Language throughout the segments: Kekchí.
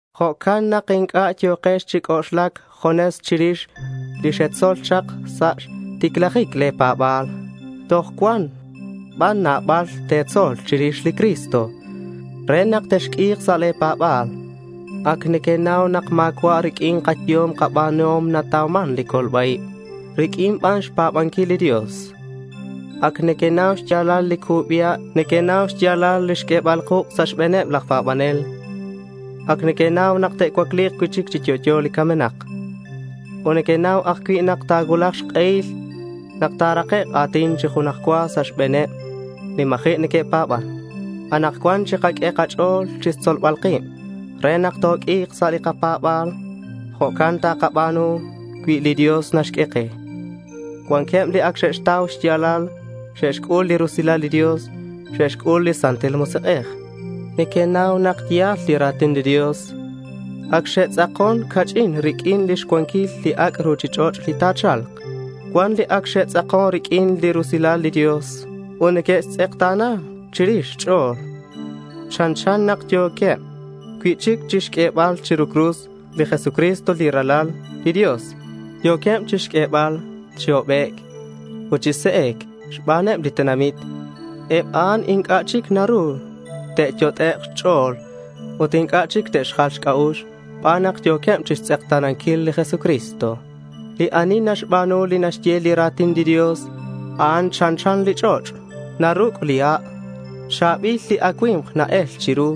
Jo'can nak inc'a' yo̱kex chi c'oxlac junes chirix li xetzol chak sa' xticlajic le̱ pa̱ba̱l. Toj cuan ban nabal te̱tzol chirix li Cristo re nak texq'ui̱k sa' le̱ pa̱ba̱l. Ac nequenau nak ma̱cua' riq'uin kayehom kaba̱nuhom natauman li colba-ib. Riq'uin ban xpa̱banquil li Dios. Ac nequenau xya̱lal li cubi ha'. Nequenau xya̱lal li xq'uebal li kuk' sa' xbe̱neb laj pa̱banel. Ac nequenau nak te'cuacli̱k cui'chic chi yo'yo li camenak. Ut nequenau ajcui' nak ta̱cuulak xk'ehil nak ta̱rakek' a̱tin chi junaj cua sa' xbe̱neb li ma̱ji' neque'pa̱ban. Anakcuan chikaq'ue kach'o̱l chixtzolbal kib re nak toq'ui̱k sa' li kapa̱ba̱l. Jo'can takaba̱nu cui li Dios naxq'ue ke. Cuanqueb li ac xe'xtau xya̱lal. Xe'xc'ul li rusilal li Dios. Xe'xc'ul li Santil Musik'ej. Neque'xnau nak ya̱l li ra̱tin li Dios. Ac xe'tz'akon ca'ch'in riq'uin lix cuanquil li ac' ruchich'och' li ta̱cha̱lk. Cuan li ac xe'tz'akon riq'uin li rusilal li Dios ut neque'xtz'ekta̱na chirix xch'o̱l. Chanchan nak yo̱queb cui'chic chixq'uebal chiru cruz li Jesucristo, li Ralal li Dios. Yo̱queb chixq'uebal chi hobec' ut chi se'e̱c xbaneb li tenamit. Eb a'an inc'a' chic naru te'yot'ek' xch'o̱l ut inc'a' chic te'xjal xc'a'ux xban nak yo̱queb chixtz'ekta̱nanquil li Jesucristo. Li ani naxba̱nu li naxye li ra̱tin li Dios, a'an chanchan li ch'och' naruc' li ha'. Cha̱bil li acui̱mk na-el chiru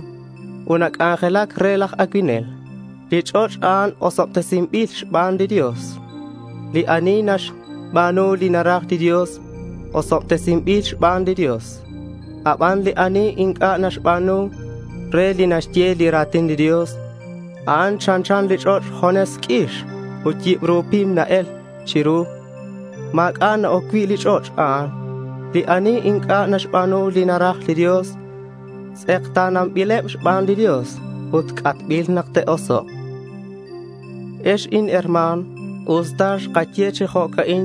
ut nac'anjelac re laj acuinel. Li ch'och' a'an osobtesinbil xban li Dios. Li ani naxba̱nu li naraj li Dios osobtesinbil xban li Dios. Aban li ani inc'a' naxba̱nu re li naxye li ra̱tin li Dios, a'an chanchan li ch'och' junes q'uix ut yibru pim na-el chiru; ma̱c'a' na-oc cui' li ch'och' a'an. Li ani inc'a' naxba̱nu li naraj li Dios, tz'ekta̱nanbileb xban li Dios ut c'atbil nak te'osok'. Ex inherma̱n, usta xkaye chi jo'can,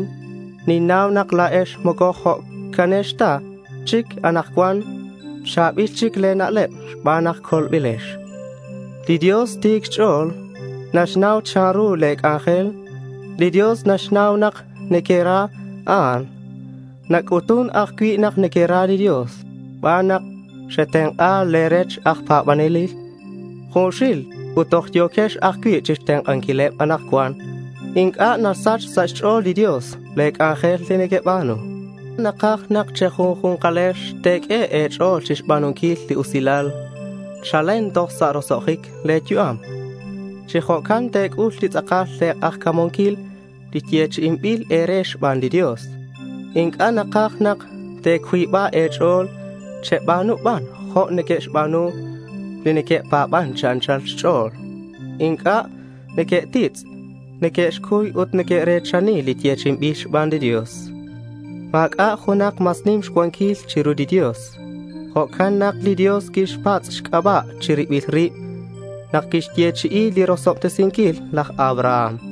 ninnau nak la̱ex moco jo'canex ta chic anakcuan. Cha̱bil chic le̱ na'leb xban nak colbilex. Li Dios ti̱c xch'o̱l. Naxnau chanru le̱ c'anjel. Li Dios naxnau nak nequera a'an. Nac'utun ajcui' nak nequera li Dios xban nak xetenk'a le̱ rech aj pa̱banel junxil ut toj yo̱quex ajcui' chixtenk'anquileb anakcuan. Inc'a' nasach sa' xch'o̱l li Dios le̱ c'anjel li nequeba̱nu. Takaj nak che̱junju̱nkalex te̱q'ue e̱ch'o̱l chixba̱nunquil li usilal chalen toj sa' roso'jic le̱ yu'am. Chi jo'can te̱c'ul chi tz'akal le̱ k'ajca̱munquil li yechi'inbil e̱re xban li Dios. Inc'a' nakaj nak te̱cuiba e̱ch'o̱l. Cheba̱nu ban jo' neque'xba̱nu li neque'pa̱ban chi anchal xch'o̱l. Inc'a' neque'titz'. Neque'xcuy ut neque're̱chani li yechi'inbil xban li Dios. Ma̱c'a' junak mas nim xcuanquil chiru li Dios. Jo'can nak li Dios quixpatz' xc'aba' chi ribil rib nak quixyechi'i li rosobtesinquil laj Abraham.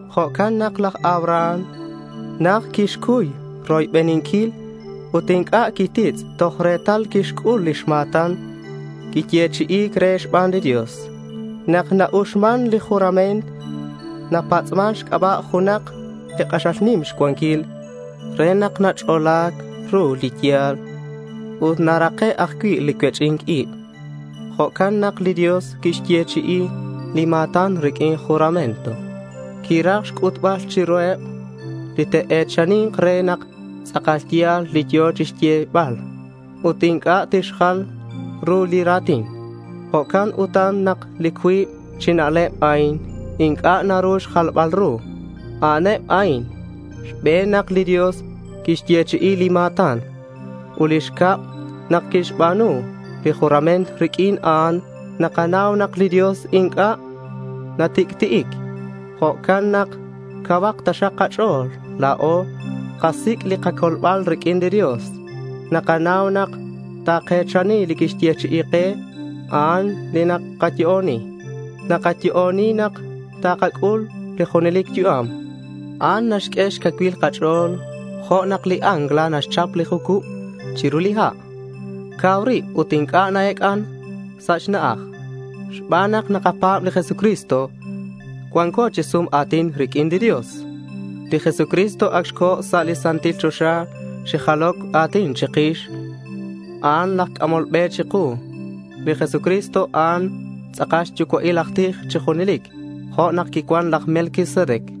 Jo'can nak laj Abraham najt quixcuy roybeninquil ut inc'a' quititz' toj retal quixc'ul lix ma̱tan quiyechi'i̱c re xban li Dios. Nak na-uxman li juramento napatz'man xc'aba' junak li k'axal nim xcuanquil re nak nach'ola ru li ya̱l ut narake' ajcui' li cuech'i̱nc ib. Jo'can nak li Dios quixyechi'i li ma̱tan riq'uin juramento. Quiraj xc'utbal chiruheb li te'e̱chani̱nk re nak tz'akal ya̱l li yo̱ chixyebal. Ut inc'a' tixjal ru li ra̱tin. Jo'can utan nak li cuib chi na'leb a'in inc'a' naru xjalbal ru. A'aneb a'in: xbe̱n, nak li Dios quixyechi'i li ma̱tan; ut xcab, nak quixba̱nu li juramento. Riq'uin a'an nakanau nak li Dios inc'a' natic'ti'ic. Jo'can nak cauhak taxak li kach'o̱l. La̱o xkasic' li kacolbal riq'uin li Dios ut nakanau nak take̱chani li quixyechi'i ke. A'an li nakayo'oni. Nakayo'oni nak takac'ul li junelic yu'am. A'an naxq'ue xcacuil li kach'o̱l jo' nak li ancla naxchap li jucub chiru li ha'. Cau rib ut inc'a' na-ec'an sa' xna'aj. Xban nak nakapa̱b li Jesucristo, cuanco chi sum a̱tin riq'uin li Dios. Li Jesucristo ac xco̱ sa' li santil choxa chi jaloc a̱tin chikix. A'an laj c'amol be chiku. Li Jesucristo, a'an tz'akal xyucua'il aj tij chi junelic jo' nak quicuan laj Melquisedec.